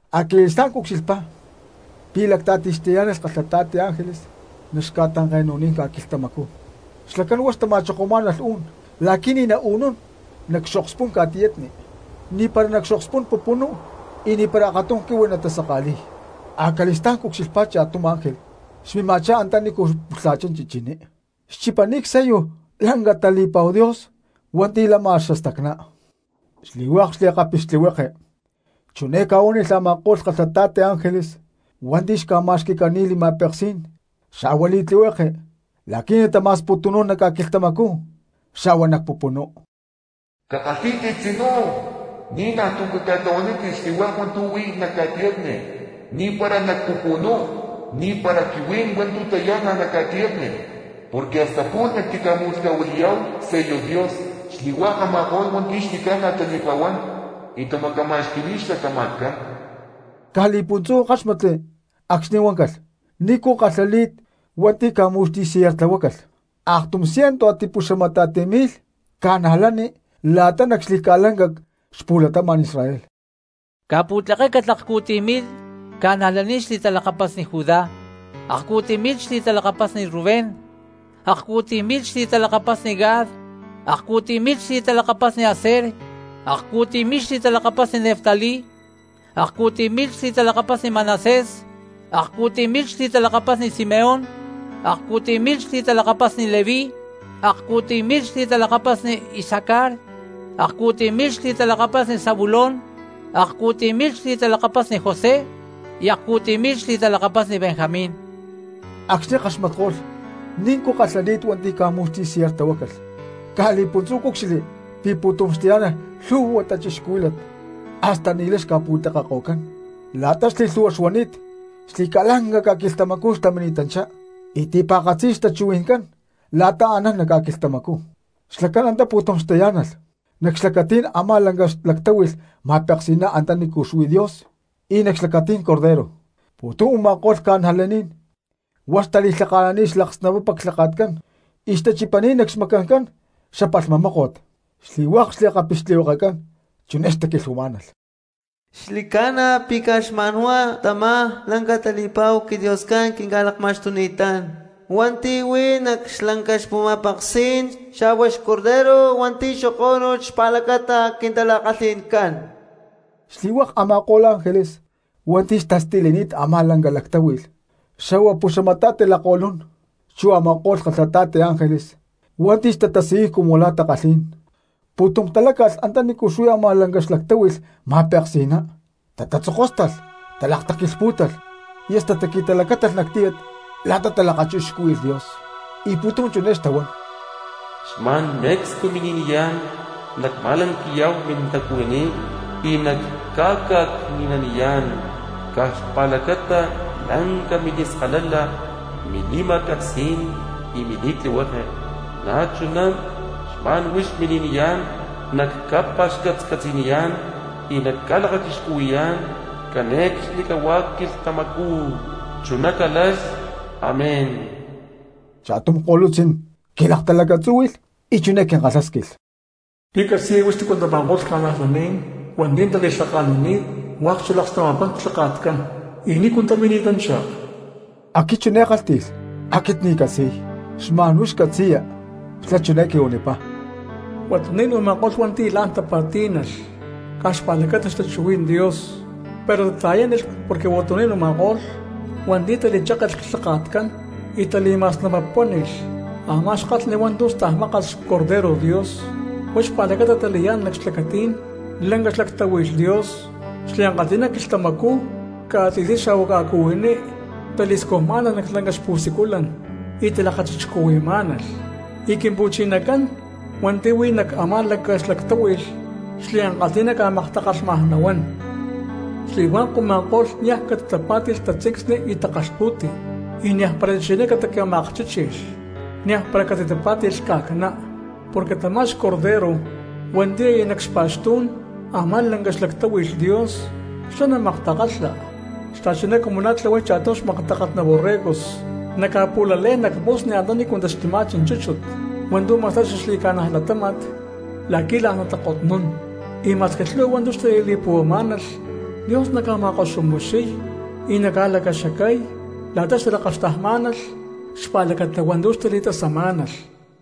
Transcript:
Acali̠stá̠n cucxilhpá pi̠ lacta̠tij xtayá̠nalh kalhata̠ti ángeles nac xca̠tanke̠nu̠ní̠n ca̠quilhtamacú, xlacán huá xtama̠chokomá̠nalh u̠n la̠qui̠ ni̠ nau̠nún nac xokspú̠n ca̠tiyatni, ni̠para nac xokspú̠n pupunú, y ni̠para akatum quihui natasaka̠li̠y. Acali̠stá̠n cucxilhpá cha̠tum ángel xmima̠chá antanícu pulha̠chá chichiní, xchipani̠t csello lanca tali̠pa̠hu Dios hua̠nti̠ lama xastacná. Xli̠hua̠k xliakapixtlihueke chiné ca̠quilhánilh a̠ma̠ko̠lh kalhata̠ti ángeles hua̠nti̠ xca̠ma̠xqui̠cani̠t li̠ma̠peksí̠n xa̠hua li̠tlihueke la̠qui̠ natama̠sputu̠nún nac ca̠quilhtamacú xa̠hua nac pupunú: —¡Cakalhí̠tit tzinú, ni̠najtu̠ caca̠tlahuanítit xli̠hua̠k hua̠ntu̠ huí nac ca̠tiyatni, ni̠para nac pupunú, ni̠para quihuí̠n hua̠ntu̠ tayá̠nalh nac ca̠tiyatni, porque hasta pu̠lh nactica̠mu̠lhca̠huili̠yá̠hu csello Dios xli̠hua̠k a̠ma̠ko̠lh hua̠nti̠ xli̠ca̠na tali̠pa̠huán y tamacama̠xqui̠ni̠t xlatama̠tcán! Caj li̠puntzú ckáxmatli acxni̠ huáncalh nícu kalhali̠t hua̠nti̠ ca̠mu̠xti̠sellartlahuácalh: aktum cientu a̠ti̠puxamata̠ti mi̠lh cristianos la̠ta nac xli̠ca̠lanca cxapu̠latama̠n Israel. Ca̠pu̠tlekécalh akcu̠tiy mi̠lh cristianos xli̠talakapasni Judá, akcu̠tiy mi̠lh xli̠talakapasni Rubén, akcu̠tiy mi̠lh xli̠talakapasni Gad, akcu̠tiy mi̠lh xli̠talakapasni Aser, akcu̠tiy mi̠lh xli̠talakapasni Neftalí, akcu̠tiy mi̠lh xli̠talakapasni Manasés, akcu̠tiy mi̠lh xli̠talakapasni Simeón, akcu̠tiy mi̠lh xli̠talakapasni Leví, akcu̠tiy mi̠lh xli̠talakapasni Isacar, akcu̠tiy mi̠lh xli̠talakapasni Zabulón, akcu̠tiy mi̠lh xli̠talakapasni José, y akcu̠tiy mi̠lh xli̠talakapasni Benjamín. Acxni̠ ckaxmatko̠lh nícu kalhali̠t hua̠nti̠ ca̠mu̠xti̠sellartlahuácalh, caj li̠puntzú cúcxilhli pi̠ pu̠tum xtayá̠nalh lhu̠hua cristianos hasta ni̠lay xca̠pu̠tlekeko̠cán la̠ta xli̠lhu̠hua xuani̠t, xli̠ca̠lanca ca̠quilhtamacú xtamini̠tanchá, y ti̠pa̠katzi xtachuhui̠ncán la̠ta anán nac ca̠quilhtamacú, xlacán antá pu̠tum xtayá̠nalh nac xlacatí̠n a̠má lanca xlactáhui̠lh ma̠peksi̠ná antanícu xuí Dios y nac xlacatí̠n xBorrego, pu̠tum u̠ma̠ko̠lh cristianos hua̠k xtali̠lhaka̠nani̠t xalaksnapapa clhaka̠tcán y xtachipani̠t nac xmacancán xapalhma mó̠ko̠t. Xli̠hua̠k xliakapixtlihuekecán chiné xtaquilhuamá̠nalh: ¡Xli̠ca̠na pi̠ caj xma̠n huá tamá lanca tali̠pa̠hu quiDioscán quinca̠lakma̠xtuni̠tán hua̠nti̠ huí nac lanca xama̠peksi̠ná lactáhui̠lh, xa̠hua xborrego hua̠nti̠ xokó̠nulh xpa̠lacata quintala̠kalhi̠ncán! Xli̠hua̠k a̠ma̠ko̠lh ángeles hua̠nti̠ xtastilini̠t a̠má lanca lactáhui̠lh, xa̠hua pu̠xamata̠ti lakko̠lún, chu a̠ma̠ko̠lh kalhata̠ti ángeles hua̠nti̠ xtatasiyuy cumu la̠ takalhí̠n, pu̠tum taláca̠lh antanícu xuí a̠má lanca xlactáhui̠lh ma̠peksi̠ná, tatatzokóstalh, talakataquilhpú̠talh, y hasta taqui̠talacátalh nac tíyat la̠ta talakachixcúhui̠lh Dios. Y pu̠tum chiné xtahuán: ¡Xma̠n me̠cstu mini̠niyá̠n nacma̠lanqui̠yá̠hu mintacuhuiní y nacca̠ca̠cni̠naniyá̠n caj xpa̠lacata lanca mili̠skalala, mili̠ma̠peksí̠n y mili̠tlihueke; na̠chuná xma̠n huix mini̠niyá̠n nacca̠pa̠xcatcatzi̠niyá̠n y naclakachixcuhui̠yá̠n cane̠cxnicahuá quilhtamacú! ¡Chuná calalh, amén! Cha̠tum ko̠lutzí̠n quilaktalacatzúhui̠lh y chiné quinkalhásquilh: —¿Pi̠ catzi̠ya huix tícu tama̠ko̠lh cristianos hua̠nti̠ tali̠lhaka̠nani̠t hua̠k xalaksnapapán clhaka̠tcán, y nícu tamini̠tanchá? Aquit chiné ckálhti̠lh: —Aquit ni̠ ccatzi̠y, xma̠n huix catzi̠ya. Xlá chiné quihuanipá: —Huatuní̠n u̠ma̠ko̠lh hua̠nti̠ la̠n tatipa̠tí̠nalh caj xpa̠lacata xtachuhuí̠n Dios, pero tata̠yánilh porque huatuní̠n u̠ma̠ko̠lh hua̠nti̠ tali̠chéke̠lh clhaka̠tcán y tali̠ma̠snapapuáni̠lh a̠má xkalhni hua̠ntu̠ stajmákalh xBorrego Dios. Huá xpa̠lacata tali̠yá̠nalh nac xlacatí̠n lanca xlactáhui̠lh Dios, xliankalhi̠na quilhtamacú ca̠tzi̠sní xa̠hua ca̠cuhuiní tali̠scujmá̠nalh nac lanca xpu̠siculan y talakachixcuhui̠má̠nalh. Y Quimpu̠chinacán hua̠nti̠ huí nac a̠má lanca xlactáhui̠lh xliankalhi̠ná ca̠maktakalhmaj nahuán. Xli̠hua̠k u̠ma̠ko̠lh cristianos niaj catitapá̠ti̠lh tatzincsni y takalhpu̠ti, y niajpara chichiní catica̠ma̠akchíchi̠lh, niajpara catitapá̠ti̠lh lhca̠cná. Porque tamá xBorrego hua̠nti̠ yá nac xpa̠xtú̠n a̠má lanca xlactáhui̠lh Dios, xlá naca̠maktakalha xta̠chuná cumu la̠ tlahuay cha̠tum xmaktakalhná borregos, naca̠pu̠lalé̠n nac musni antanícu taxtuma̠chi chúchut hua̠ntu̠ ma̠sta̠y xaxli̠ca̠na latáma̠t la̠qui̠ la̠n natakotnún, y ma̠squi lhu̠hua hua̠ntu̠ xtali̠li̠puhuamá̠nalh, Dios naca̠ma̠koxumixiy y naca̠lacaxacay la̠ta xtalakaxtajmá̠nalh xpa̠lacata hua̠ntu̠ xtali̠tasamá̠nalh.